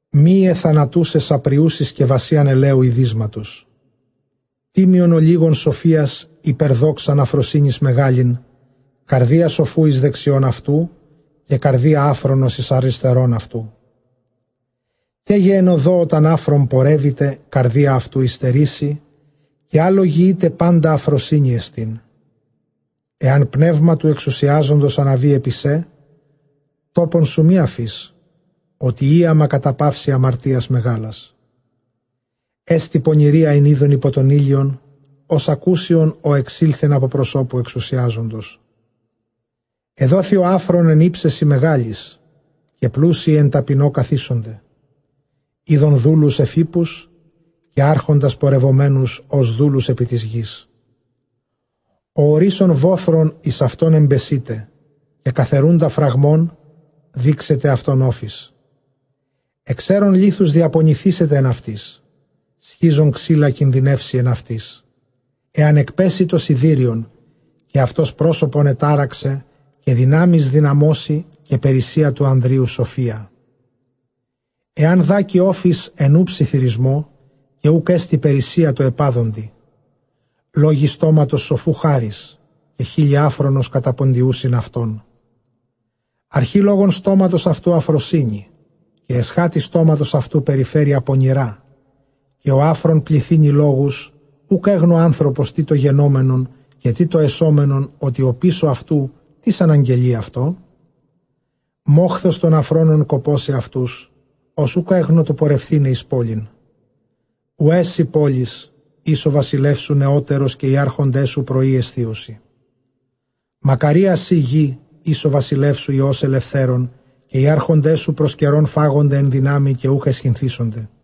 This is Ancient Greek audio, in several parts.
Μυῖαι θανατοῦσαι σαπριοῦσι σκευασίαν ἐλαίου ἡδύσματος· τίμιον ὀλίγον σοφίας ὑπὲρ δόξαν ἀφροσύνης μεγάλην. Καρδία σοφοῦ εἰς δεξιὸν αὐτοῦ, καὶ καρδία ἄφρονος εἰς ἀριστερὸν αὐτοῦ. Καί γε ἐν ὁδῷ ὅταν ἄφρων πορεύηται, καρδία αὐτοῦ ὑστερήσει, καὶ ἃ λογιεῖται πάντα ἀφροσύνη ἐστίν. Ἐὰν πνεῦμα τοῦ ἐξουσιάζοντος ἀναβῇ ἐπὶ σὲ, τόπον σου μὴ ἀφῇς, ὅτι ἴαμα καταπαύσει ἁμαρτίας μεγάλας. Ἔστι πονηρία ἣν εἶδον ὑπὸ τὸν ἥλιον, ὡς ἀκούσιον ἐξῆλθεν ἀπὸ προσώπου ἐξουσιάζοντος. Ἐδόθη ὁ ἄφρων ἐν ὕψεσι μεγάλοις, καὶ πλούσιοι ἐν ταπεινῷ καθήσονται. Εἶδον δούλους ἐφʼ ἵππους, καὶ ἄρχοντας πορευομένους ὡς δούλους ἐπὶ τῆς γῆς. Ὁ ὀρύσσων βόθρον, εἰς αὐτὸν ἐμπεσεῖται· καὶ καθαιροῦντα φραγμὸν, δήξεται αὐτὸν ὄφις, Ἐξαίρων λίθους, διαπονηθήσεται ἐν αὐτοῖς· σχίζων ξύλα, κινδυνεύσει ἐν αὐτοῖς. Ἐὰν ἐκπέσῃ τὸ σιδήριον, καὶ αὐτὸς πρόσωπον ἐτάραξε· καὶ δυνάμεις δυναμώσει, καὶ περίσσεια τῷ ἀνδρὶ οὐ σοφία. Ἐὰν δάκῃ ὄφις ἐν οὐ ψιθυρισμῷ, καὶ οὐκ ἔστι περίσσεια τῷ ἐπᾴδοντι. Λόγοι στόματος σοφοῦ χάρις, καὶ χείλη ἄφρονος καταποντιοῦσιν αὐτόν. Ἀρχὴ λόγων στόματος αὐτοῦ ἀφροσύνη, καὶ ἐσχάτη στόματος αὐτοῦ περιφέρεια πονηρὰ, καὶ ὁ ἄφρων πληθύνει λόγους· οὐκ ἔγνω ἄνθρωπος τί τὸ γενόμενον, καὶ τί τὸ ἐσόμενον, ὅ, τι ὀπίσω αὐτοῦ τίς ἀναγγελεῖ αὐτῷ; Μόχθος τῶν ἀφρόνων κακώσει αὐτοὺς, ὃς οὐκ ἔγνω τοῦ πορευθῆναι εἰς πόλιν. Οὐαί σοι πόλις ἧς ὁ βασιλεύς σου νεώτερος, καὶ οἱ ἄρχοντές σου πρωῒ ἐσθίουσι. Μακαρία σὺ γῆ, ἧς ὁ βασιλεύς σου υἱὸς ἐλευθέρων, καὶ οἱ ἄρχοντές σου πρὸς καιρὸν φάγονται ἐν δυνάμει, καὶ οὐκ αἰσχυνθήσονται.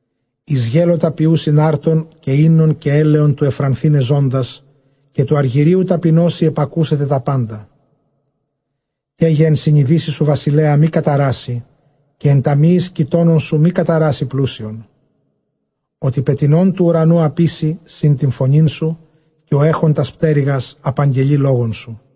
Εἰς γέλωτα ποιοῦσιν ἄρτον, καὶ οἶνον καὶ ἔλαιον τοῦ εὐφρανθῆναι ζῶντας, καὶ τοῦ ἀργυρίου ταπεινώσει ἐπακούσεται τὰ πάντα. Καί γε ἐν συνειδήσει σου βασιλέα μὴ καταράσῃ, καὶ ἐν ταμιείοις κοιτώνων σου μὴ καταράσῃ πλούσιον· ὅτι πετεινὸν τοῦ οὐρανοῦ ἀποίσει τὴν φωνήν σου, καὶ ὁ ἔχων τὰς πτέρυγας ἀπαγγελεῖ λόγον σου.